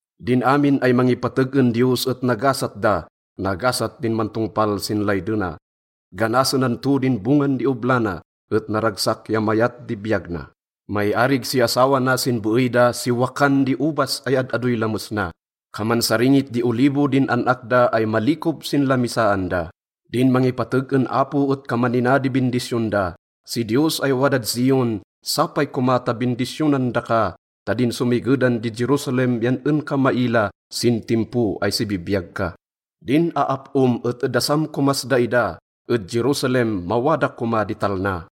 Din amin ay mangipateg en Diyos et nagasat da, nagasat din mantongpal sin laydena. Ganasenan to din bongan di obla na, et naragsak ya mayat di biyag na. Maiarig si asawa na sin beey da si wakan di obas ay ad-adoy lames na. Kaman saringit di olivo din an-ak da ay malikob sin lamisaan da. Din mangipateg en Apo et kaman nina di bindisyon da. Si Diyos ay wadad Zion, sapay koma ta bindisyonan daka ta din somigedan di Jerusalem yan en ka maila sin timpo ay sibibiyag ka. Din aap-om et edasam komas daida. Ed Jerusalem mawada koma di talna!